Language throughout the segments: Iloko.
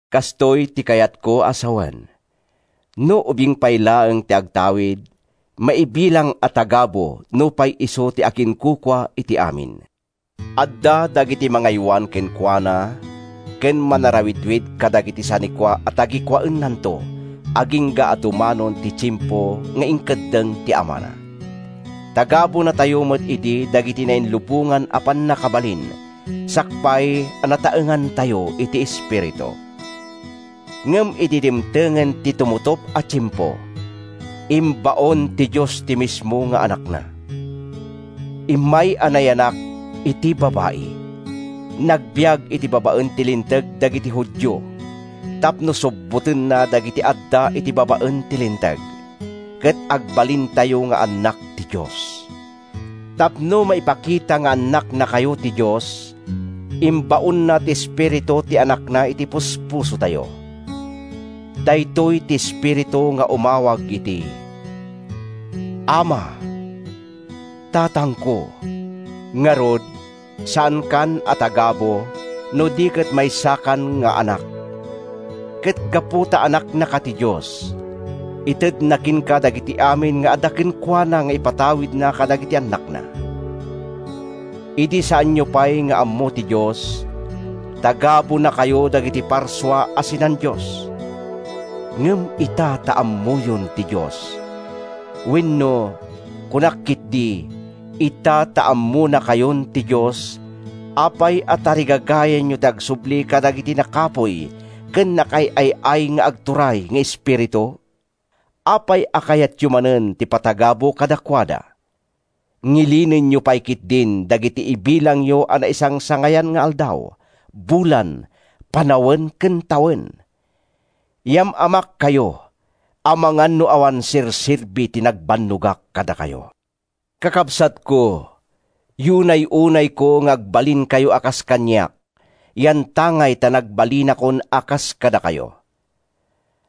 Kastoy ti kayatko a sawen: No ubing pay laeng ti agtawid, maibilang a tagabu nupay isu ti akinkukua iti amin. Adda dagiti mangaywan kenkuana ken manarawidwid kadagiti sanikua a tagikuaennanto agingga a dumanon ti tiempo nga inkeddeng ni amana. Tagabunatayo met idi dagiti nainlubongan a pannakabalin sakbay a nataengantayo iti espiritu. Ngem idi dimtengen ti tumutop a tiempo, imbaon ti Dios ti mismo nga Anakna. Immay a nayanak iti babai; nagbiag iti babaen ti Linteg dagiti Judio tapno subbotenna dagiti adda iti babaen ti Linteg, ket agbalintayo nga annak ti Dios. Tapno maipakita nga annaknakayo ti Dios, imbaonna ti Espiritu ti Anakna iti puspusotayo. Daytoy ti Espiritu nga umawag iti “Ama! Tatangko!” Ngarud, saankan a tagabu no di ket maysakan nga anak. Ket gapu ta anaknaka ti Dios, itedna kenka dagiti amin nga adda kenkuana nga ipatawidna kadagiti annakna. Idi saanyo pay nga ammo ti Dios, tagabunakayo dagiti parsua a sinan-dios. Ngem ita ta ammoyon ti Dios—wenno, kunak ketdi, ita ta ammonakayon ti Dios—apay a tarigagayanyo ti agsubli kadagiti nakapuy ken nakaay-ay-ay nga agturay nga espiritu? Apay a kayatyo manen ti patagabu kadakuada? Ngilinenyo pay ketdin dagiti ibilangyo a naisangsangayan nga aldaw, bulan, panawen ken tawen! Yam-amakkayo, amangan no awan serserbi ti nagbannogak kadakayo. Kakabsatko, yunay-unayko nga agbalinkayo a kas kaniak yantangay ta nagbalinakon a kas kadakayo.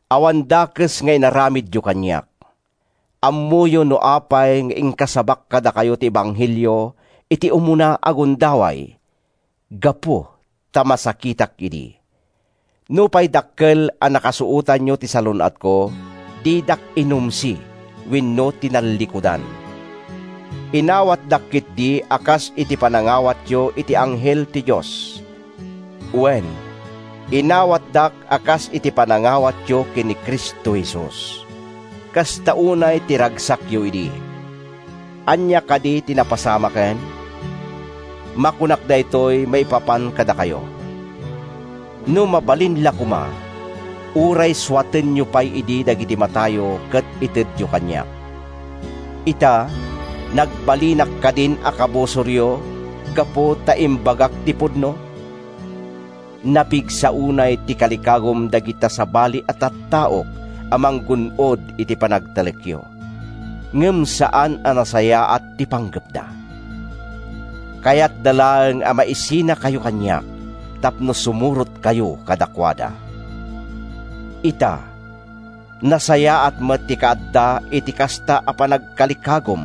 Awan dakes nga inaramidyo kaniak. Ammoyo no apay nga inkasabak kadakayo ti ebanghelio iti umuna a gundaway; gapu ta masakitak idi. Nupay dakkel a nakasuotanyo ti salun-atko, didak inumsi wenno tinallikudan. Inawatdak ketdi a kas iti panangawatyo iti anghel ti Dios. Wen, inawatdak a kas iti panangawatyo ken ni Cristo Jesus. Kasta unay ti ragsakyo idi! Ania kadi ti napasamaken? Makunak daytoy maipapan kadakayo: No mabalin la koma, uray suatenyo pay idi dagiti matayo ket itedyo kaniak. Ita, nagbalinak kadin a kabusoryo gapu ta imbagak ti pudno? Napigsa unay ti kalikagum dagita sabali a tattao a manggun-od iti panagtalekyo, ngem saan a nasayaat ti panggepda. Kayatda laeng a maisinakayo kaniak tapno sumurotkayo kadakuada. Ita, nasayaat met ti kaadda iti kasta a panagkalikagum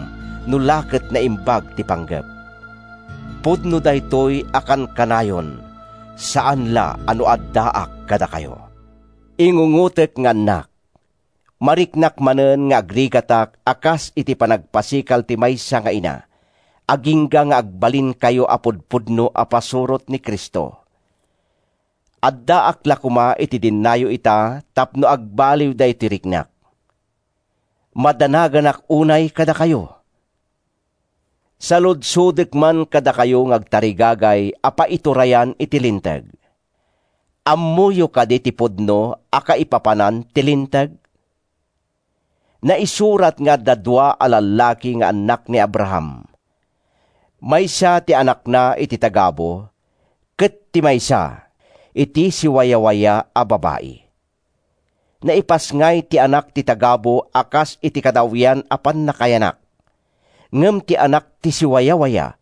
no la ket naimbag ti panggep—pudno daytoy a kankanayon, saan la a no addaak kadakayo. Ingungotek nga annak! Mariknak manen nga agrigatak a kas iti panagpasikal ti maysa nga ina, agingga nga agbalinkayo a pudpudno a pasurot ni Cristo. Addaak la koma iti dennayo ita tapno agbaliw daytoy riknak. Madanaganak unay kadakayo! Saludsodek man kadakayo nga agtarigagay a paiturayan iti Linteg: Ammoyo kadi ti pudno a kaipapanan ti Linteg? Naisurat nga adda dua a lallaki nga annak ni Abraham. Maysa ti anakna iti tagabu ket ti maysa, iti siwawayawaya a babai. Naipasngay ti anak ti tagabu a kas iti kadawyan a pannakayanak, ngem ti anak ti siwawayawaya,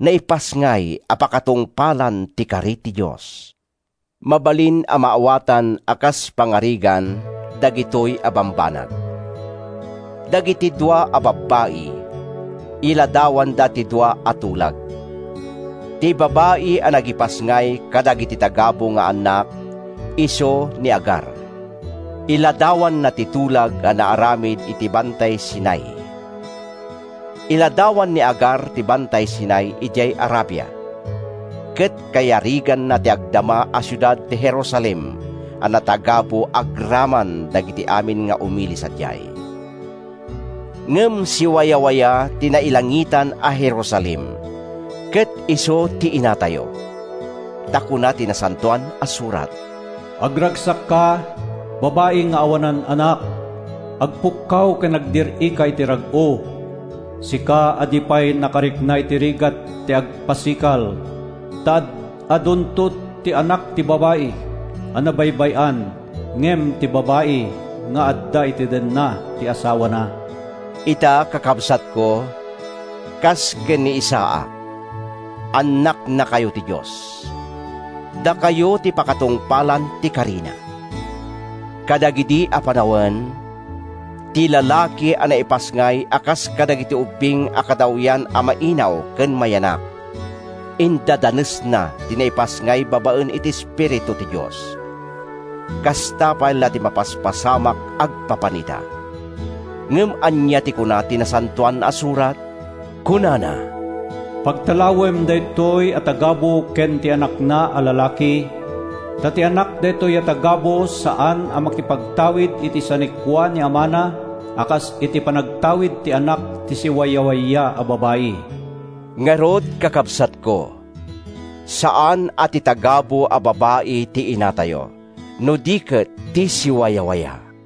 naipasngay a pakatungpalan ti kari ti Dios. Mabalin a maawatan a kas pangarigan dagitoy a bambanag. Dagiti dua a babbai, iladawanda ti dua a tulag. Ti babai a nagipasngay kadagiti tagabu nga annak isu ni Agar; iladawanna ti tulag a naaramid iti Bantay Sinai. Iladawan ni Agar ti Bantay Sinai idiay Arabia, ket kayariganna ti agdama a siudad ti Jerusalem a natagabu agraman dagiti amin nga umili sadiay. Ngem siwawayawaya ti nailangitan a Jerusalem, ket isu ti inatayo. Ta kuna ti Nasantoan a Surat: “Agragsakka, babai nga awanan anak! Agpukkaw ken agdir-ika iti rag-o, Sika a di pay nakarikna iti rigat ti agpasikal! Ta ad-adunto ti anak ti babai a nabaybay-an Ngem ti babai nga adda iti denna ti asawana.” Ita, kakabsatko, kas ken ni Isaac, annaknakayo ti Dios. Dakayo ti pakatungpalan ti karina. Kadagidi a panawen, ti lalaki a naipasngay a kas kadagiti ubbing a kadawyan a mainaw ken mayanak, indadanesna ti naipasngay babaen iti Espiritu ti Dios. Kasta pay la ti mapaspasamak agpapan ita. Ngem ania ti kuna ti Nasantoan a Surat? Kunana, “Pagtalawem daytoy a tagabu ken ti anakna a lalaki. Ta ti anak daytoy a tagabu saan a makipagtawid iti sanikua ni amana a kas iti panagtawid ti anak ti siwawayawaya a babai.” Ngarud, kakabsatko, saan a ti tagabu a babai ti inatayo, no di ket ti siwawaya.